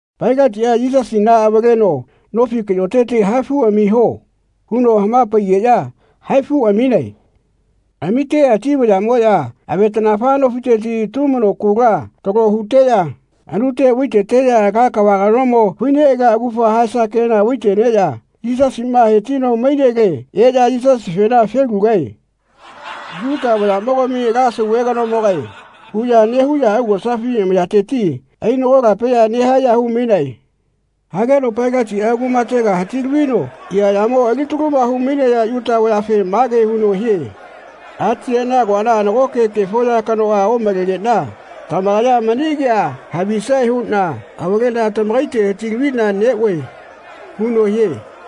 Pailatiꞌa Yisasina avaleno “Nofi kaꞌyoteti haifu amiho.” huno hama-paigeꞌya haifu aminae. Amiteꞌya ati vayaꞌmoꞌya avetaꞌnafa nofiteti tumano kula talo huteꞌya anute vai-teteꞌya ala kava kanomo fai-neꞌalia augafa haesa kena vai-teneꞌya Yisasiꞌma he-tino mainele eꞌya Yisasifena “Felugae. Yuta vayaꞌmogami ala sauve kanomogae.” huꞌya nehuꞌya augosafi amayateti ainagolapeꞌya nehaeꞌya hu-mainae. Hageno Pailatiꞌa kumatega hati-lavino eaꞌyamo alitaluma hu-mainaya Yuta vayafe mage huno hie “Atiyeꞌna agoana nagoke kefo ya kanoꞌa omalegeꞌna tamakaya mani kea havisae huꞌna avaleꞌna tamakaite hati-laviꞌna neꞌoe.” huno hie.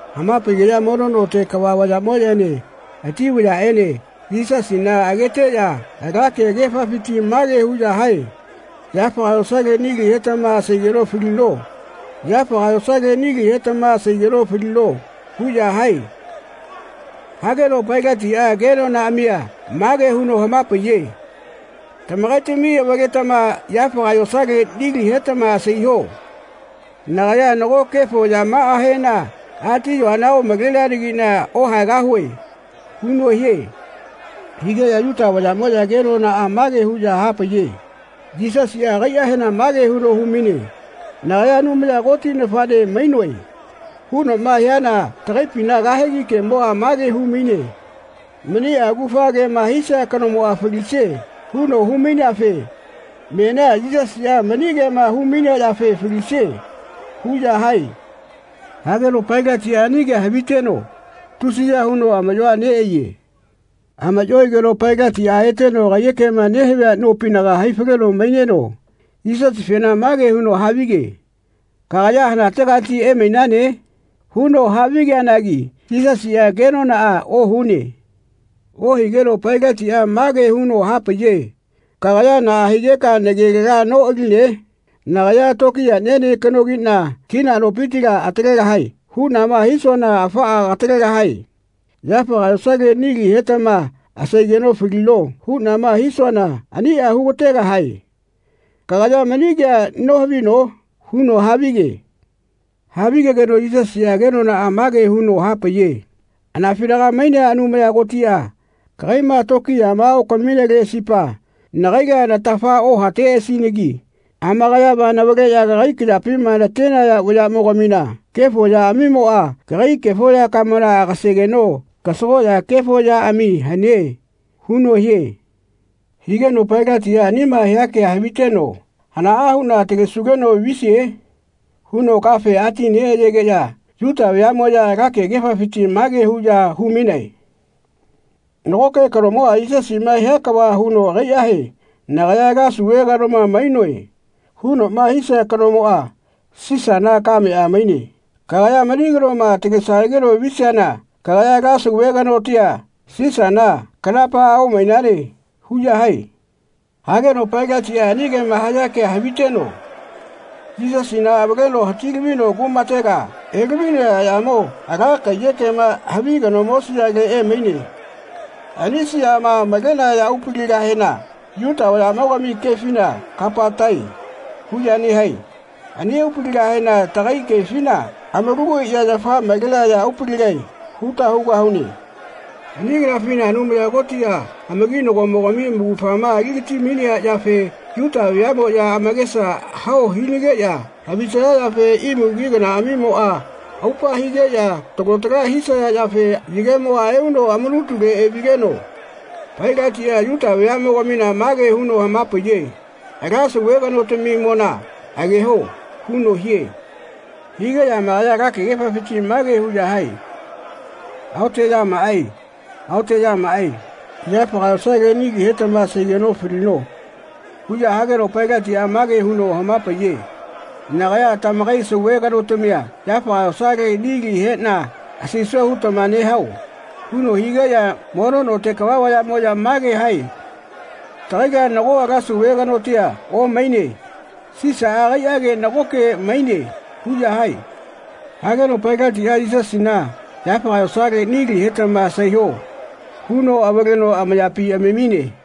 Hama-paigeꞌya mono note kava vayaꞌmoꞌyaene ati vayaꞌene Yisasina ageteꞌya ala kegefafiti mage huꞌya hae “Yafaga yosale nili hetama asaigeno falino. Yafaga yosale nili hetama asaigeno falino.” huꞌya hae. Hageno Pailatiꞌa kenonaꞌamia mage huno hama-paiye “Tamakaitami avaletama yafaga yosalela nilia hetama asaiho. Nagaya nago kefo yamaꞌahena ati-yoana omaleanagiꞌna ohaegahue.” huno hie. Higeꞌya Yuta vayaꞌmoꞌya kenonaꞌa mage huꞌya hapaiye “Yisasiꞌa agaiꞌahena mage huno hu-maine ‘Nagaya Anumaya Koti nafaꞌne mainoe.’ hunoꞌma hiana tagaipina kahegi kemoꞌa mage hu-maine ‘Maniꞌa augafa kema hisia kanomoꞌa falisie.’ huno hu-maineafe menia Yisasiꞌa mani kema hu-mainea yafe falisie.” huꞌya hae. Hageno Pailatiꞌa ani kea haviteno tusiya huno amaꞌyoa neꞌaiye. Amaꞌyo aigeno Pailatiꞌa eteno kaiyekema nehavia nopinaga hai-faleno maineno Yisasifena mage huno havige “Kagaya hanategati emainane?” huno havigeanagi Yisasiꞌa kenonaꞌa ohune. Ohigeno Pailatiꞌa mage huno hapaiye “Kagaya naꞌa higeka nagelela noꞌaline? Nagaya tokiyaꞌniene kanogiꞌna ‘Kina nopitila atalegahae.’ huꞌnama hisuana afaꞌa katalegahae. ‘Yafaga yosale nili hetama asaigeno falino.’ huꞌnama hisuana aniꞌa hu-ga-tegahae. Kagaya mani kea nohavino?” huno havige. Havigegeno Yisasiꞌa kenonaꞌa mage huno hapaiye “Anafinaga mainea Anumaya Kotiꞌa kagaiꞌma tokiyama okamineleꞌasipa nagaila natafa ohateꞌasinagi amakayama navaleꞌya kagai kayapima natenaya vayaꞌmogamina kefo yaꞌamimoꞌa kagai kefo yakamona agaseno kasagoꞌya kefo yaꞌami hane.” huno hie. Higeno Pailatiꞌa anima hia kea haviteno “Hanaꞌa huꞌna atalesugeno visie?” huno kafe ati-neꞌayegeꞌya Yuta vayaꞌmoꞌya ala kegefafiti mage huꞌya hu-mainae “Nagoke kanomoꞌa Yisasiꞌma hia kava huno agaiꞌahe ‘Nagaya ala sauve kanoma mainoe.’ hunoꞌma hisia kanomoꞌa Sisana kameꞌa maine. Kagaya mani kanoma atalesanageno visiana kagaya tagaila ala sauve kanotia, Sisana, kanapaꞌa omainane.” huꞌya hae. Hageno Pailatiꞌa ani kema haya kea haviteno Yisasina avaleno hati-lavino kumatega elavino eaꞌyamo ala kaiyekema havi kanomo siale emaine. Ani siama malenaya aupaligahena Yuta vayaꞌmogami kefina Kapatae huꞌya nehae. Ani aupaligahena tagai kefina amalagu aiꞌya yafa malenaya aupaligae huta hugahune. Ani kanafina Anumaya Kotiꞌa amakinagomogami amaugafama ali-gati-mainea yafe Yuta veaꞌmoꞌya amakesa hao hinageꞌya havisaya yafe imu ki kanaꞌamimoꞌa aupa higeꞌya talo tala hisaya yafe yagemoꞌa euno amanutule evigeno Pailatiꞌa Yuta veaꞌmogamina mage huno hama-paiye “Ala sauve kanotamimona ageho.” huno hie. Higeꞌya amakaya ala kegefafiti mage huꞌya hae “Aoteꞌyamaꞌae. Aoteꞌyamaꞌae. Yafaga yosale nili hetama asaigeno falino.” huꞌya hageno Pailatiꞌa mage huno hama-paiye “Nagaya tamakai sauve kanotamia yafaga yosale nili heꞌna asaisue hugetama nehao?” huno higeꞌya mono note kava vayaꞌmoꞌya mage hae “Tagaila nago ala sauve kanotia omaine. Sisaꞌa agaiꞌage nagoke maine.” huꞌya hae. Hageno Pailatiꞌa “Yisasina yafaga yosale nili hetama asaiho.” huno avaleno amayapi amamine.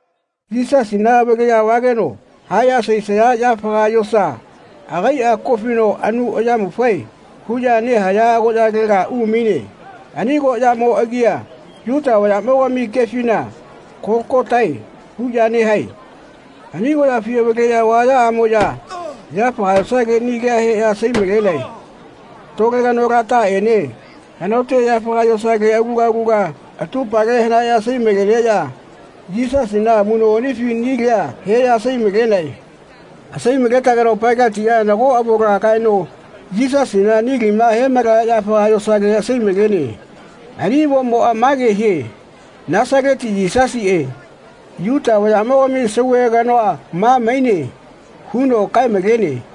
Yisasina avaleꞌya vageno haeꞌya asaisaya yafaga yosa agaiꞌa ko-fino anu ayamufae huꞌya nehaya agoꞌyalega umaine. Ani agoꞌyamo agia Yuta vayaꞌmogami kefina Kologotae huꞌya nehae. Ani agoꞌyafi avaleꞌya vayaꞌamoꞌya yafaga yosale nilia heꞌya asai-malenae. Tole kanolataꞌene hanaote yafaga yosale aluga aluga atupale hanaeꞌya asai-maleneꞌya Yisasina amuꞌnoꞌanifi nilia heꞌya asai-malenae. Asai-maletageno Pailatiꞌa nago avona kaeno Yisasina nilima he-malaya yafaga yosale asai-malene. Ani avomoꞌa mage hie “Nasaleti Yisasiꞌe, Yuta vayaꞌmogami sauve kanoa ma maine.” huno kae-malene.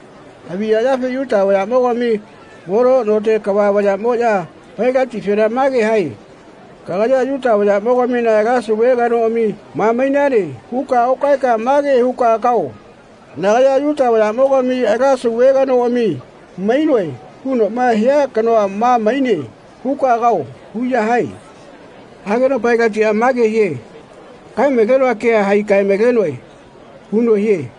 Haviya yafe Yuta vayaꞌmogami mono note kava vayaꞌmoꞌya Pailatifena mage hae “Kagaya ‘Yuta vayaꞌmogamina ala sauve kanoꞌami ma maine.’ huka okaeka ma ke huka kao ‘Nagaya Yuta vayaꞌmogami ala sauve kanoꞌami mainoe hunoꞌma hia kanoa ma maine.’ huka kao.” huꞌya hae. Hageno Pailatiꞌa mage hie “Kae-malenoa kea hai kae-malenoe.” huno hie.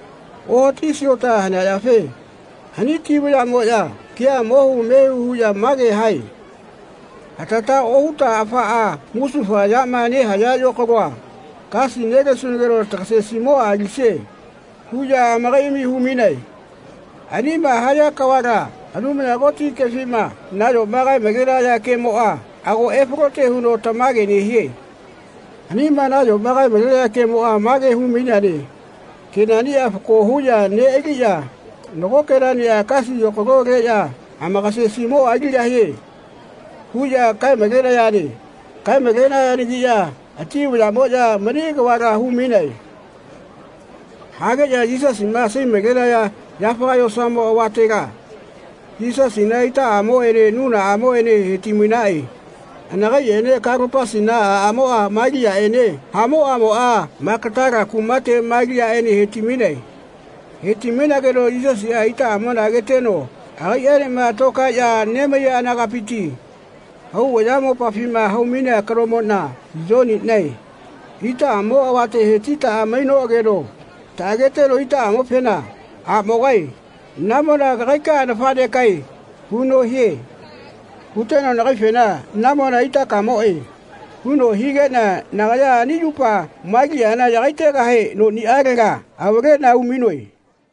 Ohati siota hanea yafe ani ati vayaꞌmoꞌya kea mohu mehu huꞌya mage hae “Hatata ohuta afaꞌa musufa yama nehaya yokaloa kasi nelesunageno tagasesimoꞌa alisie.” huꞌya amakaiꞌami hu-mainae. Aniꞌama haya kavala Anumaya Koti kefima nayoma kae-malenaya kemoꞌa ago efalote huno tamage nehie. Anima nayoma kae-malenaya kemoꞌa mage humaineane “Kenaꞌniꞌa fako huꞌya neꞌaliꞌya nago kenaꞌniꞌa kasi yokalo-leꞌya amakasesimoꞌa aligahie.” huꞌya kae-malenayane. Kae-malenayanagiꞌya ati vayaꞌmoya mani kavala hu-mainae. Hageꞌya Yisasima asai-malenaya yafaga yosamo avatela Yisasina itaꞌamoꞌene nunaꞌamoꞌene he-ti-mainaꞌe. Anakaiꞌene Kalopasina aꞌamoꞌa Maliaꞌene hamoꞌamoꞌa Magatala kumate Maliaꞌene he-ti-mainae. He-ti-mainageno Yisasiꞌa itaꞌamona ageteno agaiꞌenema tokaeꞌya nemaiya anagapiti hau ayamopafima hau-mainea kanomoꞌna, Yoniꞌnae, itaꞌamo avate he-titaꞌa mainoꞌageno taꞌageteno itaꞌamofena “Aꞌmogae namona kagaikaꞌa nafaꞌnekaꞌae.” huno hie. Huteno nagaifena “Namona itakamoꞌe.” huno higeꞌna nagaya ani yupa Maliana yagaigahe noniꞌalega avaleꞌna umainoe.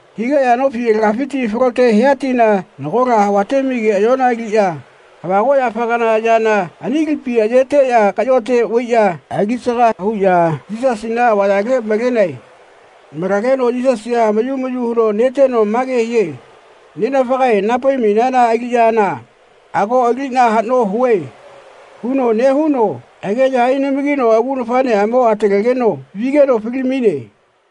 Higeꞌya nofi alagafiti falote hia tina nagola havate-mai keꞌayola aliꞌya havagoꞌyafa kana yana ani lipi ayeteꞌya kaꞌyote vaiꞌya ali-saga huꞌya Yisasina avayale malenae. Malageno Yisasiꞌa mayu mayu huno neteno mage hie “Nenafagae naha-pai-mainana aliꞌyana ago aliꞌna haꞌno hue.” huno nehuno ageꞌya ainamagino agu nafaꞌneꞌamo atalegeno vigeno fali-maine.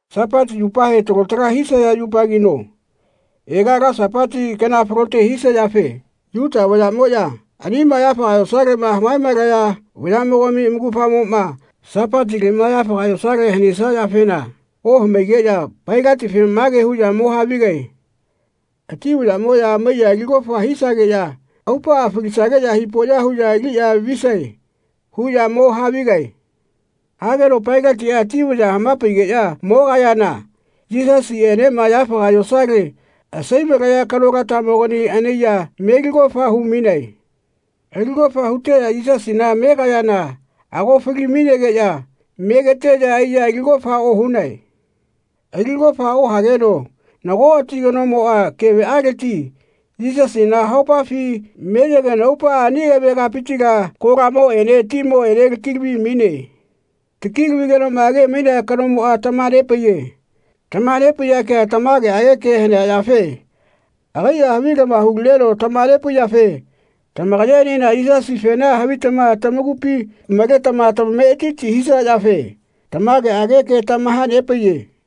Sapati yupahe talo tala hisaya yupagino ega ala Sapati kana falote hisia yafe Yuta vayaꞌmoꞌya anima yafaga yosaleꞌma hamae-malaya vayaꞌmogami amaugafamoꞌma Sapatileꞌma yafaga yosale hanesia yafena ohamaigeꞌya Pailatife mage huꞌya mo havigae “Ati vayaꞌmoꞌya amaiya ali kofa hisageꞌya aupaꞌa falisageꞌya hipoꞌya huꞌya aliꞌya visae.” huꞌya mo havigae. Hageno Pailatiꞌa ati vaya hama-paigeꞌya mogayana Yisasiꞌenema yafaga yosale asai-malaya kanolatamogani anaiya meli kofa hu-mainae. Ali kofa huteꞌya Yisasina megayana ago fali-mainegeꞌya megeteꞌya aiya ali kofa ohunae. Ali kofa ohageno nago ati kanomoꞌa keveꞌaleti Yisasina haohipafi meyegeno aupaꞌa ani keve kapitila kolamoꞌene timoꞌene taki-lavi-maine. Taki-lavigenoꞌma age-mainea kanomoꞌa tamaha-nepaiye. Tamaha-nepaiya kea tamageꞌage ke hanea yafe agaiꞌa havilama hu-lineno tamaha-nepaiyafe tamakayaenena Yisasifena havitama tamakupi maletama tamametiti hisaya yafe tamageꞌage ke tamaha-nepaiye.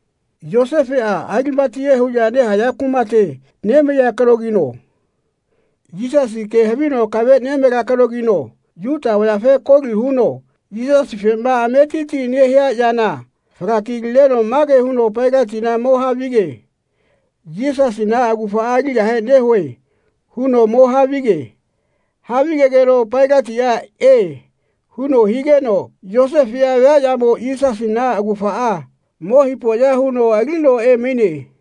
Yosefeꞌa Alimatiyae huꞌya nehaya kumate nemaiya kanogino Yisasi ke havino akave nemalea kanogi Yuta vayafe koli huno Yisasifema ametiti nehia yana fala-ki-lineno mage huno Pailatina mo havige “Yisasina augafaꞌa aligahe nehue.” huno mo havige. Havigegeno Pailatiꞌa “E.” huno higeno Yosefeꞌa viaꞌyamo Yisasina augafaꞌa mo hipoꞌya huno alino emaine.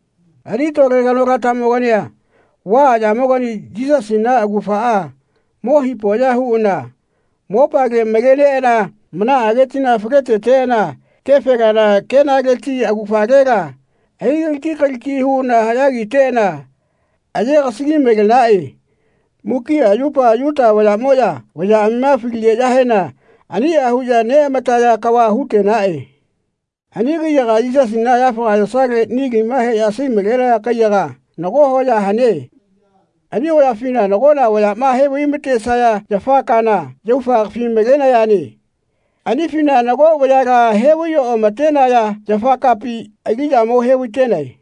Ani tole kanolatamogania vaꞌaꞌyamogani Yisasina augafaꞌa mo hipoꞌya huꞌana mopale maleneꞌana manaꞌage tina fale-teteꞌana kefe kana kenaleti augafalela ai-galaki galaki huꞌana haꞌya kiteꞌana aye-gasagi-malenaꞌe. Mukiꞌa yupa Yuta vayaꞌmoꞌya vayaꞌamima faligeꞌya aniꞌa huꞌya neꞌamataya kava hu-tenaꞌe. Ani kaiyaga Yisasina yafaga yosale nilima heꞌya asai-malenaya kaiyaga nago hoya hane. Ani hoyafina nagola vayaꞌma he-vai-ma-tesaya yafa kana, yaufa kafi-malenayane. Anifina nago vayala he-vai-oꞌama-tenaya yafa kapi aliꞌya mo he-vai-tenae.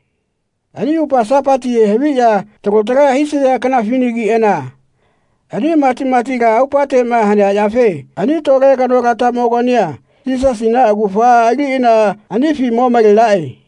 Ani yupa Sapatihe haviꞌya talo tala hisaya kanafinagiꞌana ani matimatila aupateꞌma hanea yafe ani tole kanolatamogania Yisasina augafaꞌa aliꞌana anifi mo malenaꞌe.